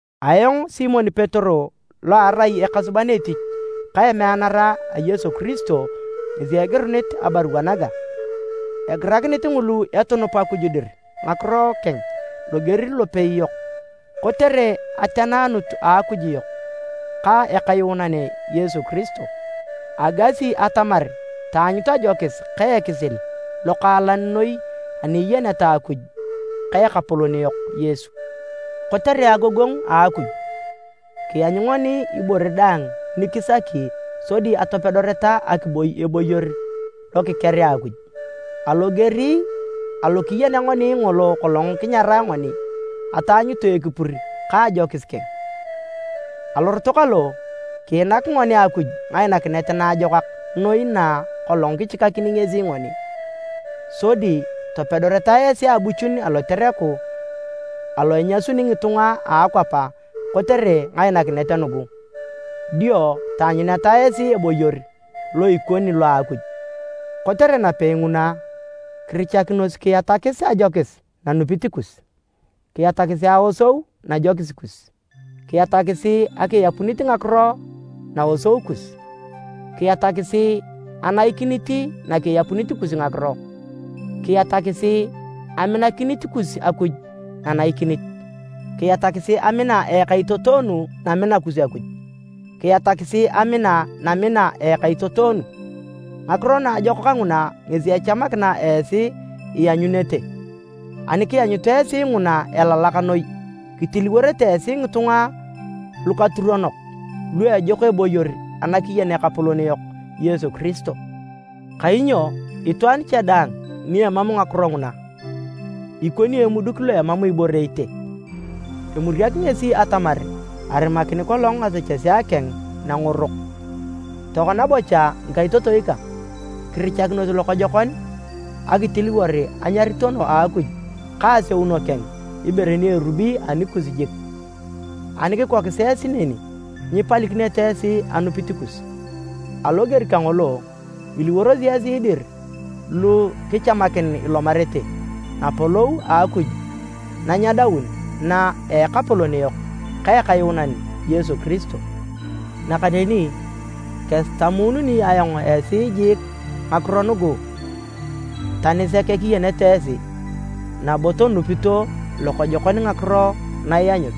Ayong Simon Petero lo arai ekasuban etich ka emeanara a Yesu Kiristo ngesi egirunit abarua naga. Egirakinit ngulu etunup Akuj dir ngakiro keng loger lopei yok, kotere ateneanut a Akuj yok ka Ekayuunan Yesu Kiristo. Agasi atamar taanyut ajokis ka ekisil lokaalan noi ani iyeneta Akuj ka Ekapolon yok Yesu. Kotere agogongu a Akuj, kianyu ngoni ibore daang ni kisaki sodi atopedoreta akiboi eboyor lokikerea Akuj. Aloger alo kiyenea ngoni ngolo kolong kinyarae ngoni ataanyutu ekipur ka ajokis keng. Alorot kalo, kiinak ngoni Akuj ngainakinet naajokak noi na kolong kichikakini ngesi ngoni. Sodi topedoreta esi abuchun alotereku alo inyasuni ngitunga a akwap kotere ngainakinet nugu. Dio taanyuneta esi eboyor lo ikoni lo Akuj. Kotere napei nguna, kirichakinos kiatakis ajokis nanupit kus, kiatakisi aosou najokis kus, kiatakisi akiapunit ngakiro naosou kus, kiatakisi anaikinit nakiapunit kus ngakiro, kiatakisi aminakinit kus Akuj nanaikinit, kiatakisi amina a ekaitotoonu namina kus Akuj, kiatakisi amina namina a ekaitotoonu. Ngakiro naajokak nguna ngesi echamakina esi ianyunete. Ani kianyut esi nguna elalak noi, kitiliworete esi ngitunga lukaturonok, lu ejok eboyor anakiyen Ekapolon yok Yesu Kiristo. Kainyo itwaan cha daang ni emam ngakiro nguna, ikoni emuduk lo emam ibore itee. Emuriak ngesi atamar arimakin kolong ngasechesea keng nangorok. Tokona bocha ngikaitotoi kang, kirichakinos lokojokon akitiliwor anyaritono a Akuj ka aseuno keng ibore ni erubi anikus jik, ani kikokis esi neni, nyipalikinete esi anupit kus. Aloger kangolo, iliworosi esi dir lu kichamakin ilomarete Napolou a Akuj na nyedaun na a Ekapolon yok ka Ekayuunan Yesu Kiristo. Nakaneni kesitamununi ayong esi jiik ngakiro nugu, tani sek kiyenete esi, nabo tonupito lokojokon ngakiro na ianyut.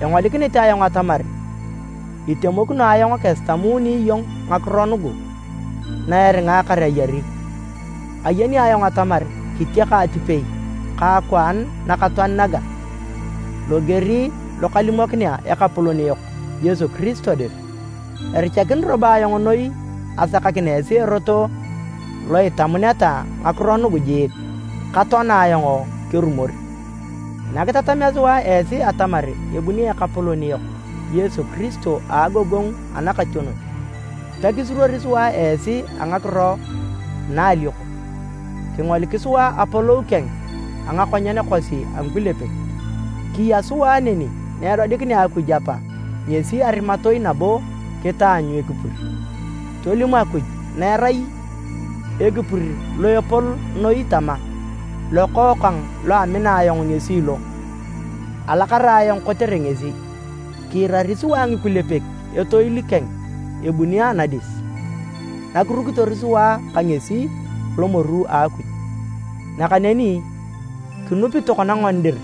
Engolikinit ayong atamar itemokino ayong kesitamuni iyong ngakiro nugu na eringaakar ayari. Ayeni ayong atamar kitiaka atipei ka akwaan nakatoan naga, loger lo kalimokinea Ekapolon yok Yesu Kiristo dir. Erichakin robo ayong noi asakakin esi erot lo itamuneta ngakiro nugu jiik, katoana ayong kerumor. Nakitatamea sua esi atamar ebuni Ekapolon yok Yesu Kiristo a agogongu anakationon, pekisuruori sua esi a ngakiro na a alioko. Kingolik sua apolou keng a ngakonyen kosi a ngikulepek. Kiya sua neni na edodikinea Akuj Apa ngesi arimatoi nabo kitaanyu ekipur. Tolim Akuj na erai Ekipur lo Epol noi tama, “Lokookang lo amina ayong ngesi lo, alakara ayong kotere ngesi!” Kiirari sua ngikulepek etoil keng ebuni anadis, nakirukitor sua ka ngesi alomoru a Akuj. Nakaneni kinupi tokona ngoni dir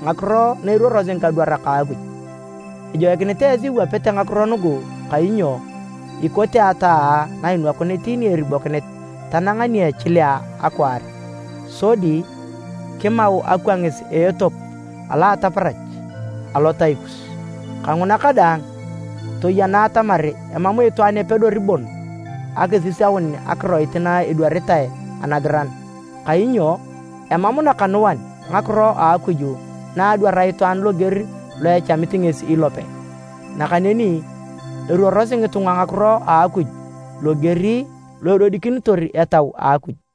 ngakiro na eruorosi ngikadwarak a Akuj. Ejoikinit esi iwapete ngakiro nugu kainyo ikote ataa na inwakunit ni eribokinit tanang ni echilea akwaar sodi kimau akwangis a etop alo a ataparach alotai kus. Kanguna kadaang, toyena atamar emam itwaan epedori bon akisisaun akiroit na edwaritae Anagiran. Kainyo emam nakanuan ngakiro a Akuj na adwar itwaan loger lo echamit ngesi ilope. Nakaneni eruorosi ngitunga ngakiro a Akuj loger lo edodikinitor Etau a Akuj.